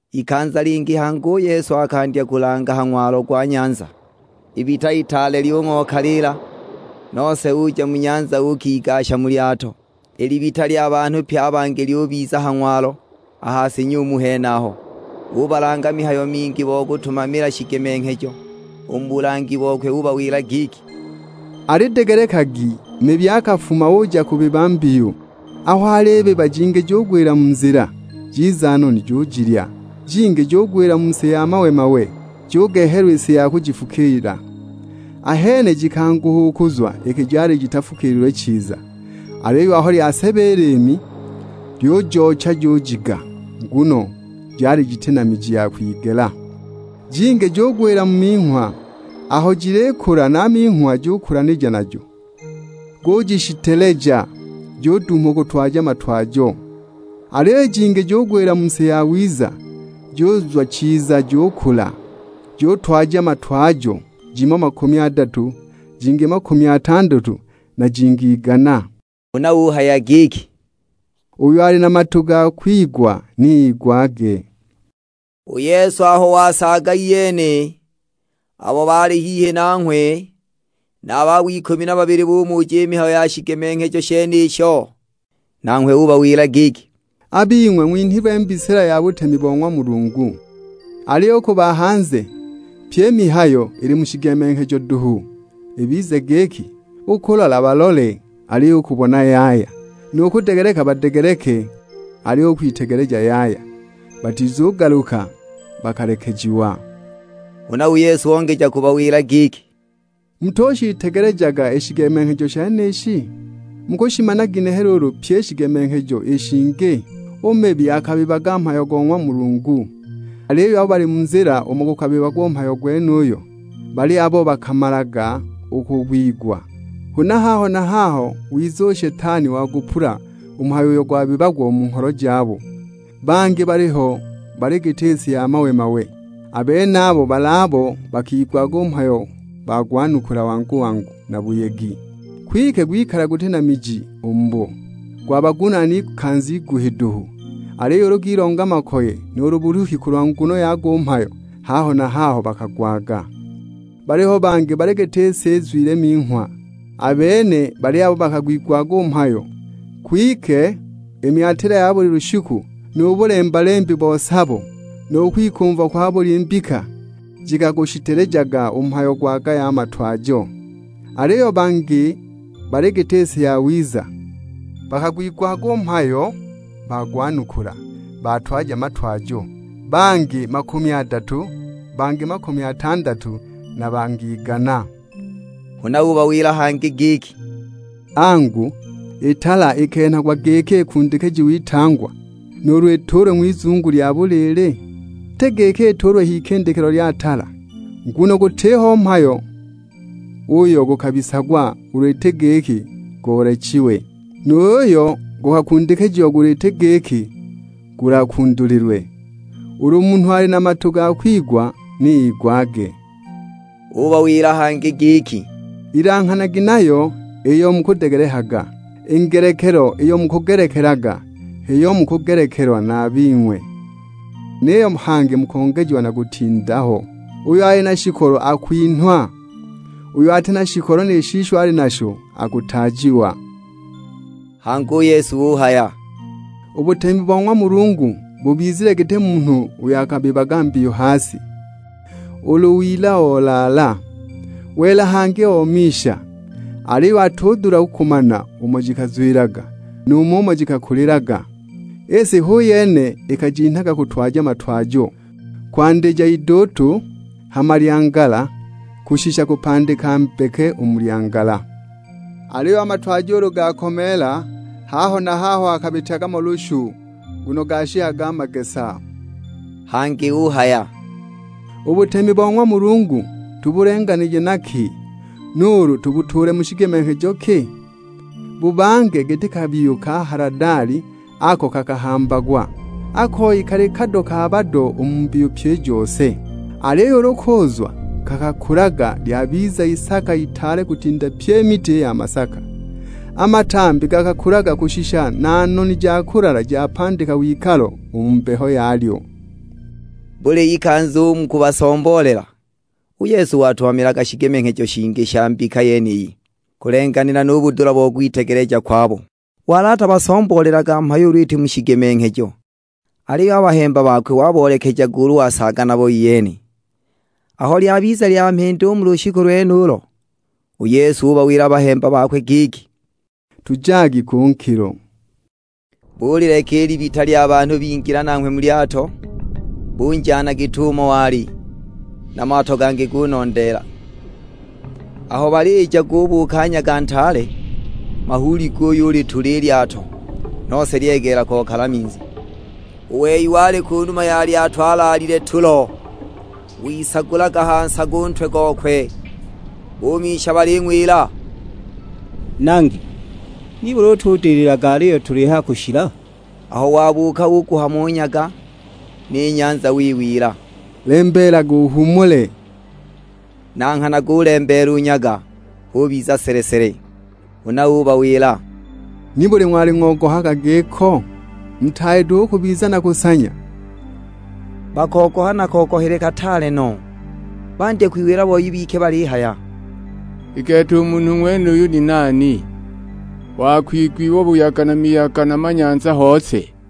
Ikanza lingi hangi u Yesu akandya kulanga ha ng'walo gwa nyanza. Ibita itaale lyung'okaliila, nose uja mu nyanza uukigasha mu lyato; i libita lya banhu pye a bangi lyubiza ha ng'walo, a ha si nyumu henaho. Ubalanga mihayo mingi bo kutumamila shigemenghejo; u mu bulangi bokwe ubawila giki, "Alidegelekagi; mibi akafuma, uja kubiba mbiyu. Aho alibiba jingi jugwila mu nzila, jiza noni jujilya. Jingi jugwila mu si ya mawe-mawe, jugehelwa i si ya kujifukiila, ahene jikanguha u kuzwa iki jali jitafukiililwe chiza. Aliyo aho lyaseba i liimi, lyujoocha jujiga, nguno jali jiti na miji ya kwigela. Jingi jugwila mu minghwa, aho jilikula na a minghwa gukulanija najo, gujishiteleja; juduuma u kutwaja a matwajo. Aliyo i jingi jikagwila mu si yawiza, juzwa chiza jukula, jutwaja matwajo: jimo makumi adatu, jingi makumi atandatu, na jingi igana." Huna uhaya giki, "Uyo ali na matu gakigwaga ni igwage." U Yesu aho wasaaga iyene, abo baali hihi nanghwe, na a babo ikumi na babili bumuja i mihayo ya shigemenghejo shenisho. Nanghwe ubawila giki, "A bing'we ng'winhilwe i mbisila ja butemi bo ng'wa Mulungu. Aliyo u ku ba hanze, pyi i mihayo ili mu shigemenghejo duhu. Ibize giki, 'U kulola balole, aliyo u kubona yaya, nu kudegeleka badegeleke, aliyo u kwitegeleja yaya, batizugaluka, bakalekejiwa!' " Huna u Yesu ongeja kubawila giki, "Mutushiitegelejaga i shigemenghejo shenishi? Mukushimana ginehe luulu pyi i shigemenghejo i shingi? U mibi akabibaga mhayo go ng'wa Mulungu. Aliyo abo bali mu nzila umo gukabibagwa u mhayo gwenuyo, bali abo bakamalaga u kugwigwa, huna haho na haho wiza u Shetani wagupula u mhayo uyo gwabibagwa u mu ngholo jabo. Bangi baliho bali giti si ya mawe-mawe, a benabo bali abo bakagwigwaga u mhayo bagwanukula wangu-wangu na buyegi. Kwike gwikala guti na miji u mubo, gwabagunaana ikanza iguhi duhu, aliyo ulu gilonga makoye, nuulu buluhi kulwa nguno yago u mhayo, haho na haho bakagwaga. Baliho bangi bali giti si izwile minghwa; a bene bali abo bakagwigwaga u mhayo, kwike i myatila ya buli lushiku, nu bulemba-lembi bo sabo, nu kwikumva kwa buli mbika, shikagushitelejaga u mhayo gwagaya a matwajo! Aliyo bangi bali giti si yawiza; bakagwigwaga u mhayo bagwanukula, batwaja matwajo: bangi makumi adatu, bangi makumi atandatu, na bangi igana." Huna ubawila hangi giki, "Angu, i tala ikenhagwa giki ikundikijiwe itangwa, nuulu ituulwe ng'wizungu lya buliili? Iti giki ituulwe h'ikindikilo lya tala? Nguno gutiho mhayo uyo gukabisagwa ulu iti giki guloolechiwe, nu yuyo gukakundikijiagwa ulu iti giki gulakundulilwe! Ulu munhu ali na matu gakigwaga ni igwage." Ubawila hangi giki, "Ilanghanagi nayo iyo mukudegelekaga, i ngelekelo iyo mukugelekelaga, h'iyo mukugelekelwa na a bing'we, niyo hangi mukongejiwa na kutinda ho. Uyo ali na shikolo akwinhwa, uyo ati na shikolo ni shisho ali nasho akutaajiwa!" Hangi u Yesu uhaya, "U butemi bo ng'wa Mulungu bubizile giti munhu uyo akabibaga mbiyu ha si. Ulu wila olaala, wela hangi omisha, aliyo atudula u kumana umo jikazwilaga nu mumo jikakulilaga. I si hu yene ikajinhaga kutwaja matwajo; kwandija iduutu, hama lyangala, kushisha kupandika mbeke u mu lyangala. Aliyo a matwajo ulu gakomeela, haho na haho akabityaga mo lushu, nguno gashikaga a magesa." Hangi uhaya, "U butemi bo ng'wa Mulungu tubulenganije na ki, nuulu tubutuule mu shigemenghejo ki? Bubange giti kabiyu ka haladali ako kakahambagwa; a koyi kali kado ka bado u mu mbiyu pyi i jose. Aliyo ulu kuuzwa, kakakulaga lyabiza isaka itaale kutinda pye i miti ya masaka. A matambi gakakulaga kushisha na noni ja kulala japandika wikalo u mu mbeho yalyo." Buli ikanza u mu kubasomboolela, u Yesu watumamilaga shigemenghejo shingi sha mbika yeniyi, kulenganila nu budula bo kwitegeleja kwabo. Wali atabasomboolelaga mhayo ulu iti mu shigemenghejo, aliyo a bahemba bakwe waboolekejaga ulu wasaaga nabo iyene. Aho lyabiza lya mhindi u mu lushiku lwenulo, u Yesu ubawila a bahemba bakwe giki, "Tujagi ku nkilo." Bulileka i libita lya banhu bingila nanghwe mu lyato, bunjana git'umo wali; na mato gangi gulondeela. Aho balija gubuuka nyaga ntaale, mahuuli guyulitula i lyato, nose lyegeela kokala minzi. U wei wali ku numa ya lyato alaalile tulo, wisagulaga ha nsago u ntwe gokwe. Bumisha baling'wila, "Nangi, nibuli utudililaga aliyo tulihaya kushila?" Aho wabuuka uguhama u nyaga; ni nyanza wiwila, "Lembeelaga, uhuumule." Na nghana gulembeela u nyaga, hubiza sele-sele. Huna ubawila, "Nibuli ng'wali ng'ogohaga giko? Mutaali duhu u kubiza na kusanya?" Bakogoha na kogohele kataale no, bandya kwiwila boi bike balihaya, "I gete u munhu ng'wenuyu ni nani, wa kwigwiwa buyaga na miyaga na manyanza hose?"